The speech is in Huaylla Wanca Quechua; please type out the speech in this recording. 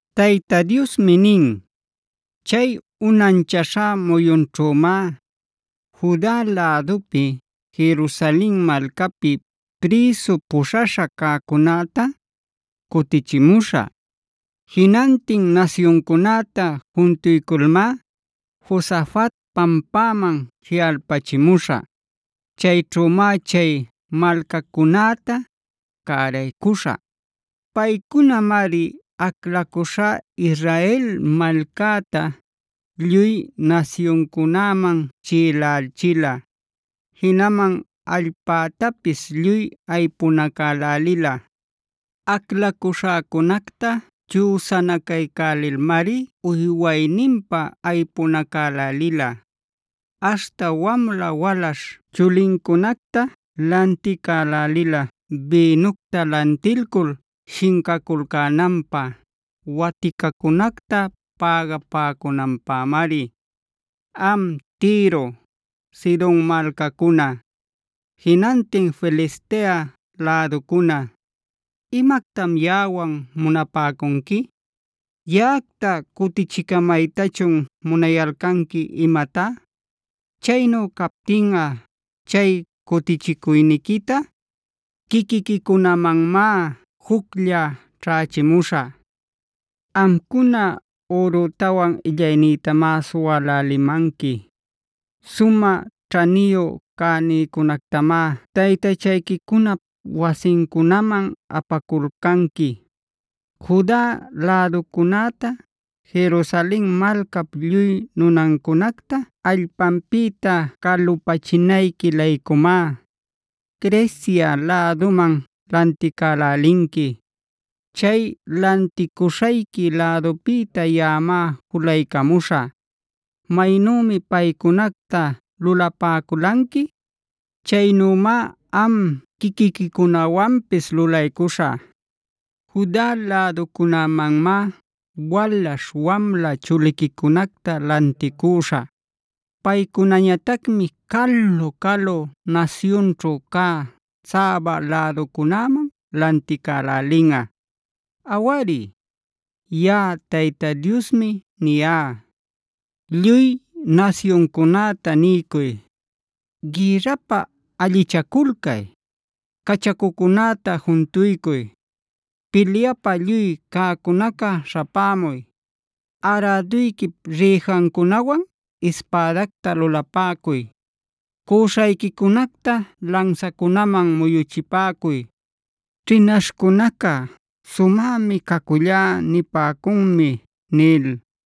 Tayta Diosmi nin: “Chay unanchaśha muyunćhümá Juda lädupi, Jerusalen malcapi prïsu puśhaśha cäcunäta cutichimuśhä. Jinantin nasyuncunäta juntuyculmá Josafat pampaman jiꞌalpachimuśhä. Chayćhümá chay malcacunäta cäraycuśhä. Paycunamari aclacuśhá Israel malcäta lluy nasyuncunäman chiꞌilächila, jinaman allpätapis lluy aypunacälälila. Aclacuśhäcunacta chüsanacaycälilmari uywayninpä aypunacälälila. Aśhta wamla walaśh chulincunacta lanticälälila bïnucta lantilcul shincaculcänanpä, waticacunacta pägapäcunanpämari. “Am Tiro, Sidon malcacuna,a jinantin Filistea läducuna,b ¿imactam yaꞌawan munapäcunqui? ¿Yaꞌacta cutichicämaytachun munayalcanqui imatá? Chaynu captinꞌa chay cutichicuyniquita quiquiquicunamanmá juclla ćhächimuśhä. Amcuna, ürütawan illaynïtamá suwälälimanqui. Sumä ćhaniyu cänïcunactamá taytachayquicunap wasincunaman apaculcanqui. Juda läducunäta, Jerusalen malcap lluy nunancunacta allpanpïta calupachinayqui-laycumá, Grecia läduman lanticälälinqui. Chay lanticuśhayqui lädupïta yaꞌamá julaycamuśhä. Maynümi paycunacta lulapäculanqui, chaynümá am quiquiquicunawanpis lulaycuśhä. Juda läducunämanmá walaśh wamla chuliquicunacta lanticüśhä. Paycunañatacmi calu-calu nasyunćhu cä Sabac läducunäman lanticälälinꞌa. Awari, yaꞌa Tayta Diosmi niyá. “Lluy nasyuncunäta niycuy: ¡Gïrrapä allichaculcay! ¡Cachacucunäta juntuycuy! ¡Pilyapä lluy cäcunaca śhapämuy! Aräduyquipd rïjancunawan ispädacta lulapäcuy; cüśhayquicunacta lansacunaman muyuchipäcuy.e Ćhinaśhcunaca ‘sumämi cacullá’ nipäcuchun” nil.